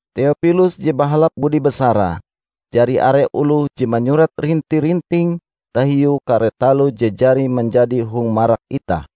Teopilus je bahalap budi basarae, Jari are oloh je manyurat rinti-rinting tahiu kare taloh je jari manjadi hong marak itah.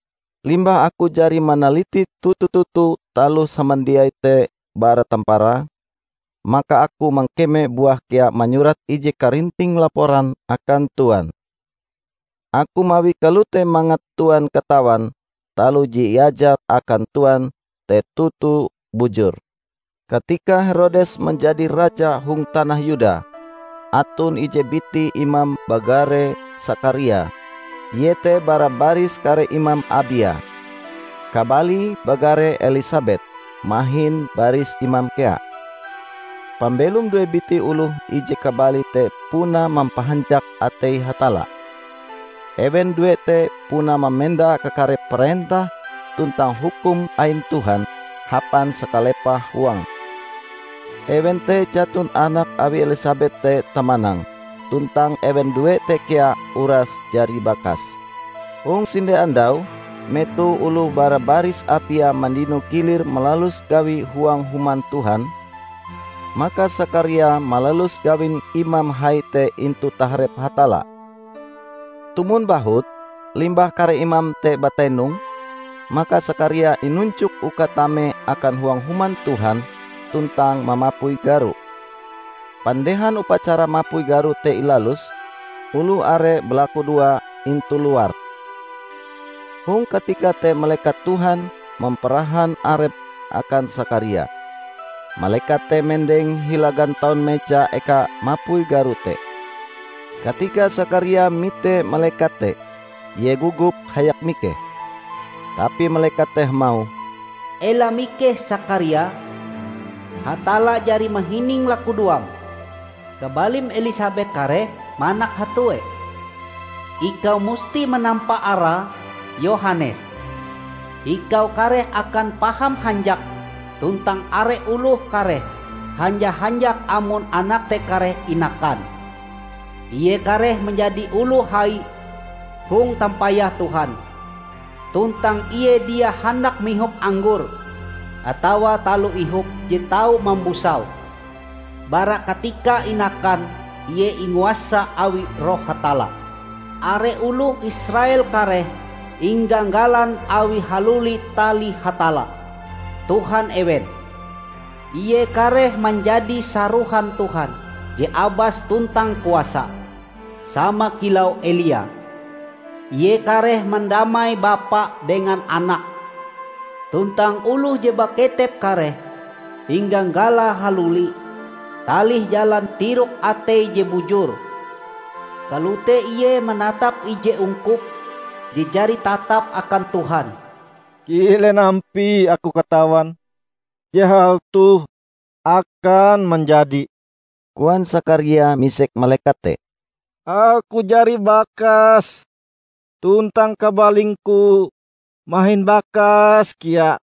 Limbah aku jari manaliti toto-toto taloh samandiai te bara tamparae, maka aku mangkeme buah kea manyurat ije karinting laporan akan Tuan. Aku mawie kalote mangat Tuan katawan taloh je iajar akan Tuan te toto bujur. Katika Herodes manjadi raja hong tanah Yuda, aton ije biti imam bagare Sakaria, ie te bara baris kare imam Abia. Kabalie bagare Elisabet, mahin baris imam kea. Pambelom due biti oloh ije kabali te puna mampahanjak atei Hatalla. Ewen due te puna mamenda kakare parentah tuntang hukum ain Tuhan hapan sakalepah huange. Ewen te jaton anak awi Elisabet te tamanang tuntang ewen due te kea uras jari bakas. Hong sinde andau, metoh oloh bara baris Abia mandino gilir malalus gawi huang Human Tuhan, maka Sakaria malalus gawin imam hai te intu taharep Hatalla. Tumon bahut, limbah kare imam te batenong, maka Sakaria inunjok uka tame akan huang Human Tuhan tuntang mamapui garo. Pandehan upacara mapui garo te ilalus, oloh are balakudoa intu luar. Hong katika te malekat Tuhan mamparahan arepe akan Sakaria. Malekat te mendeng hila gantaun meja eka mapui garo te. Katika Sakaria mite malekat te, ie gogop hayak mikeh. Tapi malekat te hamauh, "Ela mikeh, Sakaria! Hatalla jari mahining lakudoam. Kabalim Elisabet kareh manak hatue. Ikau musti manampa arae Yohanes. Ikau kareh akan paham hanjak tuntang are oloh kareh hanja-hanjak amon anak te kareh inakan! Ie kareh manjadi oloh hai hong tampayah Tuhan, tuntang ie dia handak mihop anggor atawa taloh ihop je tau mambusau. Bara katikae inakan ie inguasa awi Roh Hatalla. Are oloh Israel kareh ingagalan awie haluli talih Hatalla, Tuhan ewen. Ie kareh manjadi sarohan Tuhan je abas tuntang kuasa sama kilau Elia. Ie kareh mandamai bapa dengan anake, tuntang oloh je baketep kareh ingagalae haluli talih jalan tirok atei je bujur. Kalote ie manatap ije ungkup je jari tatap akan Tuhan." "Kilen ampie aku katawan je hal toh akan manjadi?" koan Sakaria misek malekat te. "Aku jari bakas, tuntang kabalingku mahin bakas kea."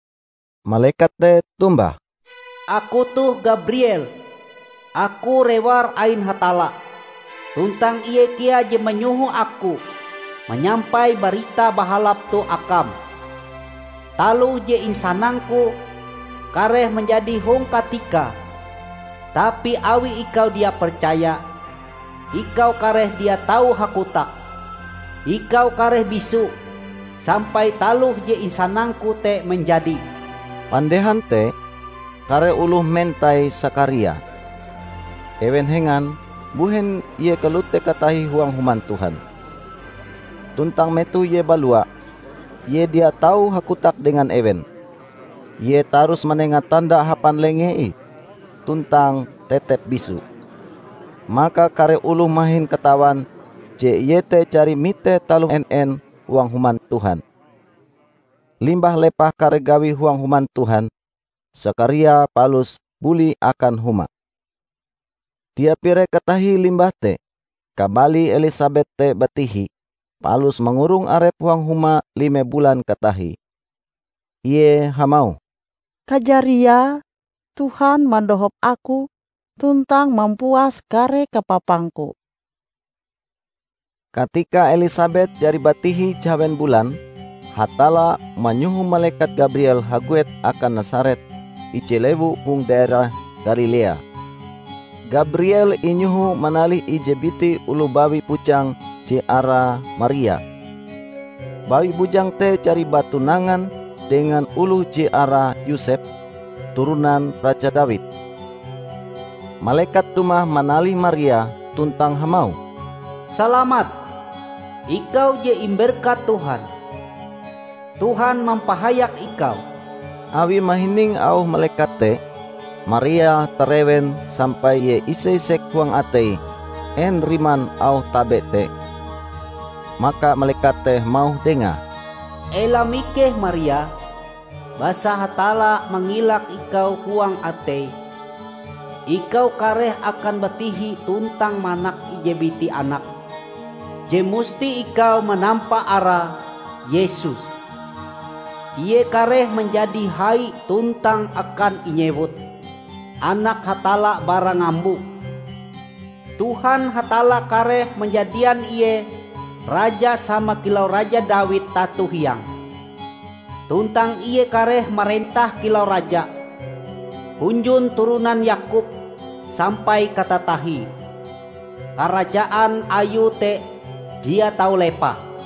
Malekat te tombah, "Aku toh Gabriel. Aku rewar ain Hatalla tuntang Ie kea je manyoho aku manyampai barita bahalap toh akam. Taloh je insanangku, kareh manjadi hong katikae. Tapi awi ikau dia percaya, ikau kareh dia tau hakotak; ikau kareh bisu sampai taloh je insanangku te manjadi." Pandehan te, kare oloh mentai Sakaria. Ewen hengan, mbuhen ie kalote katahie huang Human Tuhan. Tuntang metoh ie balua, ie dia tau hakotak dengan ewen. Ie tarus manenga tanda hapan lengee ih, tuntang tetep bisu. Maka kare oloh mahin katawan je ie te jari mite taloh en-en huang Human Tuhan. Limbah lepah kare gawie huang Human Tuhan, Sakaria palus buli akan huma. Dia pire katahie limbah te, kabalie Elisabet te batihi, palus mangurong arepe huang huma lime bulan katatahie. Ie hamauh, "Kajariae, Tuhan mandohop aku tuntang mampuas kare kapapangku." Katika Elisabet jari batihi jahawen bulan, Hatalla manyoho malekat Gabriel haguet akan Nasaret, ije lewu hong daerah Galilea. Gabriel inyoho manalih ije biti oloh bawi bujang je arae Maria. Bawi bujang te jari batunangan dengan oloh je arae Yosep, turonan raja Dawid. Malekat dumah manalih Maria tuntang hamauh, "Salamat, ikau je imberkat Tuhan! Tuhan mampahayak ikau!" Awi mahining auh malekat te, Maria tarewen sampai ie ise-isek huang ateie en riman auh tabe te. Maka malekat te hamauh dengae, "Ela mikeh Maria, basa Hatalla mangilak ikau huang ateie. Ikau kareh akan batihi tuntang manak ije biti anak je musti ikau manampa arae Yesus. Ie kareh manjadi hai tuntang akan inyewut Anak Hatalla Bara Ngambo. Tuhan Hatalla kareh manjadian Ie Raja sama kilau Raja Dawid, tato hiange. Tuntang Ie kareh marentah kilau Raja hunjun turonan Yakob sampai katatahie. Karajaan Ayue te dia tau lepah."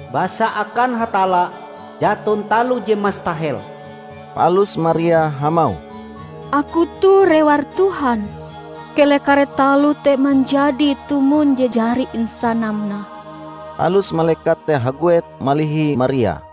Basa akan Hatalla jaton taloh je mastahel." Palus Maria hamauh, "Aku toh rewar Tuhan; keleh kare taloh te manjadi tumon je jari insanam nah." Palus malekat te haguet malihi Maria.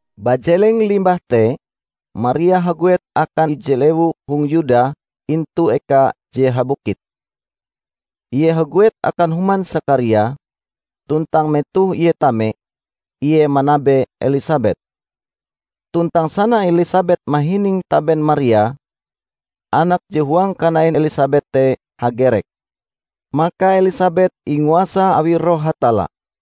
Bajeleng limbah te, Maria haguet akan ije lewu hong Yuda intu eka je habukit. Ie haguet akan human Sakaria, tuntang metoh ie tame, ie manabe Elisabet. Tuntang sana Elisabet mahining taben Maria, anak je huang kanain Elisabet te hagerek. Maka Elisabet inguasa awi Roh Hatalla,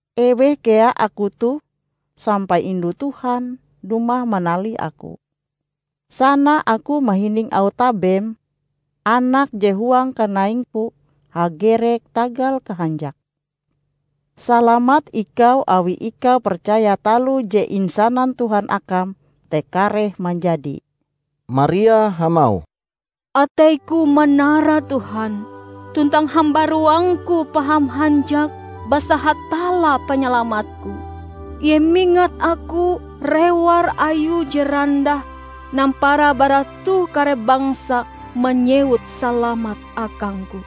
Eweh kea aku toh sampai indu Tuhan dumah manalih aku? Sana aku mahining auh tabem, anak je huang kanaingku, hagerek tagal kahanjake. Salamat ikau awi ikau percaya taloh je insanan Tuhan akam te kareh manjadi!" Maria hamauh, "Ateiku manara Tuhan, tuntang hambaruangku paham hanjak basa Hatalla Panyalamatku. Ie mingat aku, rewar Ayue je randah! Nampara bara toh kare bangsa manyewut salamat akangku.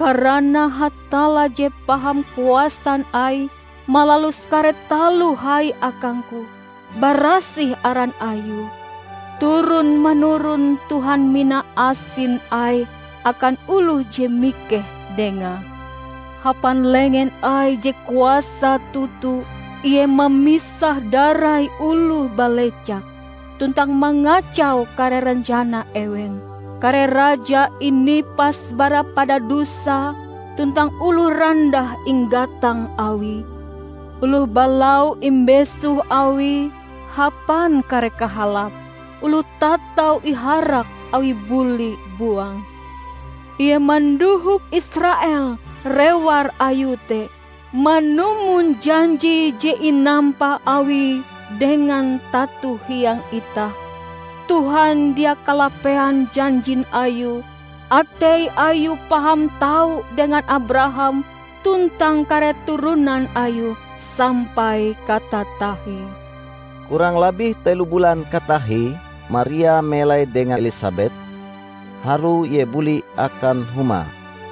Karana Hatalla je paham kuasan Aie malalus kare taloh hai akangku. Barasih aran Ayue. Turon-manuron Tuhan mina asin Aie akan oloh je mikeh Dengae. Hapan lengen Aie je kuasa toto Ie mamisah-darai oloh balecak, tuntang mangacau kare rencana ewen. Kare raja inipas bara padadusae tuntang oloh randah inggatang Awie. Oloh balau imbesoh Awie hapan kare kahalap, oloh tatau iharak Awie buli buang. Ie mandohop Israel rewar Ayue te, manumon janji je inampa Awie dengan tato hiang itah. Tuhan dia kalapean janjin Ayue, Atei Ayue paham tau dengan Abraham tuntang kare turonan ayue sampai katatahie." Kurang labih telo bulan katatahie Maria melai dengan Elisabet, harue ie buli akan humae.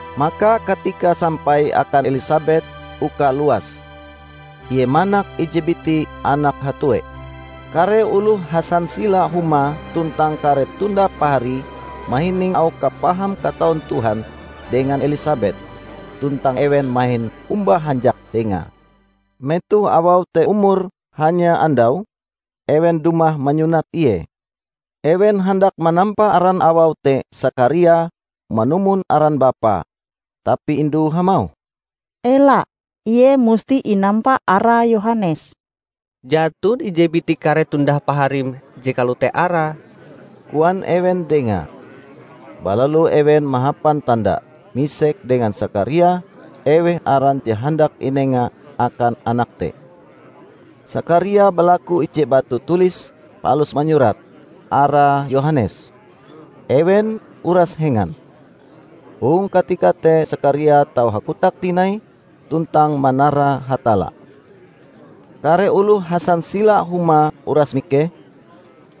Maka katikae sampai akan Elisabet uka luas. Ie manak ije biti anak hatue. Kare oloh hasansila humae tuntang kare tundah paharie mahining auh kapaham kataun Tuhan dengan Elisabet, tuntang ewen mahin omba hanjak dengae. Metoh awau te umure hanya andau, ewen dumah manyunat ie. Ewen handak manampa aran awau te Sakaria manumon aran bapae, tapi indue hamauh, "Ela! Ie musti inampa arae Yohanes." "Jaton ije biti kare tundah paharim je kalote arae," koan ewen dengae. Balalu ewen mahapan tanda, misek dengan Sakaria eweh aran je handak inenga akan anake te. Sakaria balaku ije batu tulis palus manyurat, "arae Yohanes." Ewen uras hengan. Hong katika te Sakaria tau hakotak tinai tuntang manara Hatalla. Kare oloh hasansila humae uras mikeh,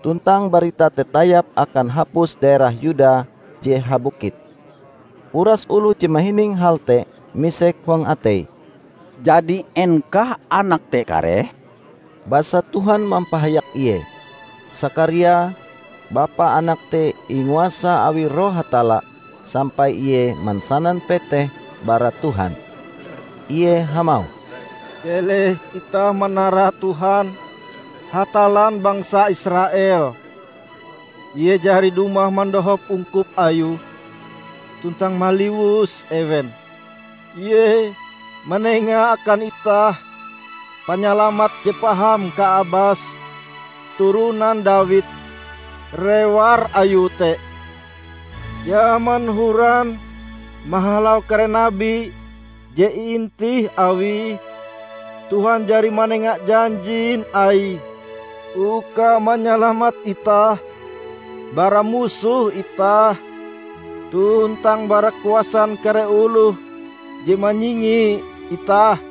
tuntang barita te tayap akan hapus daerah Yuda je habukit. Uras oloh je mahining hal te, misek huang ateie, "Jadi en kah anak te kareh?" Basa Tuhan mampahayak ie. Sakaria, bapa anak te inguasa awi Roh Hatalla sampai ie mansanan peteh bara Tuhan. Ie hamauh, "Keleh itah manara Tuhan, Hatallan bangsa Israel! Ie jari dumah mandohop ungkup Ayue tuntang maliwus ewen. Ie manenga akan itah panyalamat je paham kaabase turonan Dawid, rewar Ayue te. Jaman horan mahalau kare nabi je iintih Awie, Tuhan jari manenga janjin Aie uka manyalamat itah bara musoh itah tuntang bara kuasan kare oloh je manyingi itah.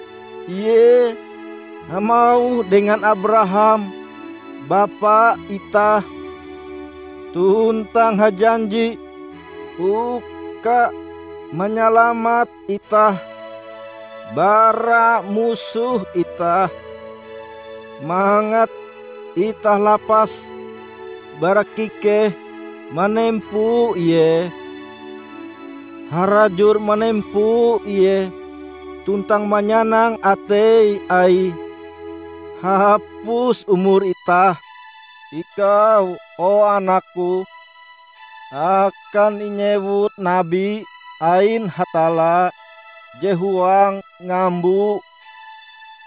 Ie hamauh dengan Abraham bapa itah, tuntang hajanji uka manyalamat itah bara musoh itah, mangat itah lapas bara kikeh manempo Ie harajur manempo Ie tuntang manyanang atei Aie hapus umur itah. Ikau o, anakku, akan inyewut nabi ain Hatalla je huang ngambo.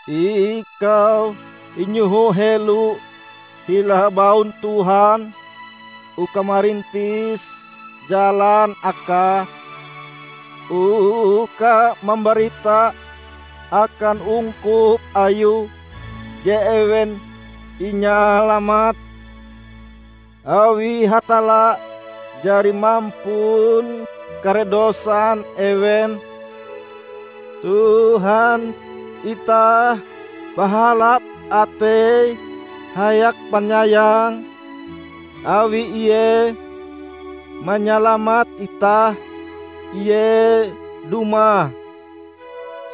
Ikau inyoho helo hila baun Tuhan uka marintis jalan Akae, uka mambarita akan ungkup Ayue je ewen inyalamat, awi Hatalla jari mampun kare dosan ewen. Tuhan itah bahalap atei hayak panyayang; awi Ie manyalamat itah Ie dumah.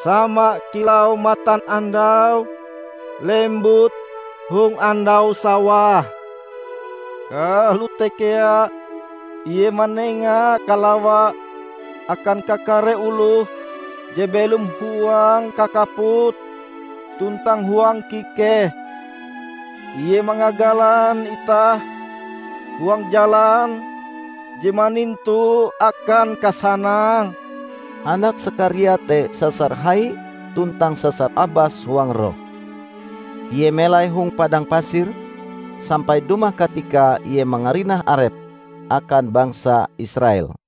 Sama kilau matanandau lembut hong andau sawah, kalote kea Ie manenga kalawae akan kakare oloh je belom huang kakaput tuntang huang kikeh. Ie mangagalan itah huang jalan je manintu akan kasanang." Anak Sakaria te sasar hai tuntang sasar abas huang roh. Ie melai hong padang pasir, sampai dumah katikae ie mangarinah arepe akan bangsa Israel.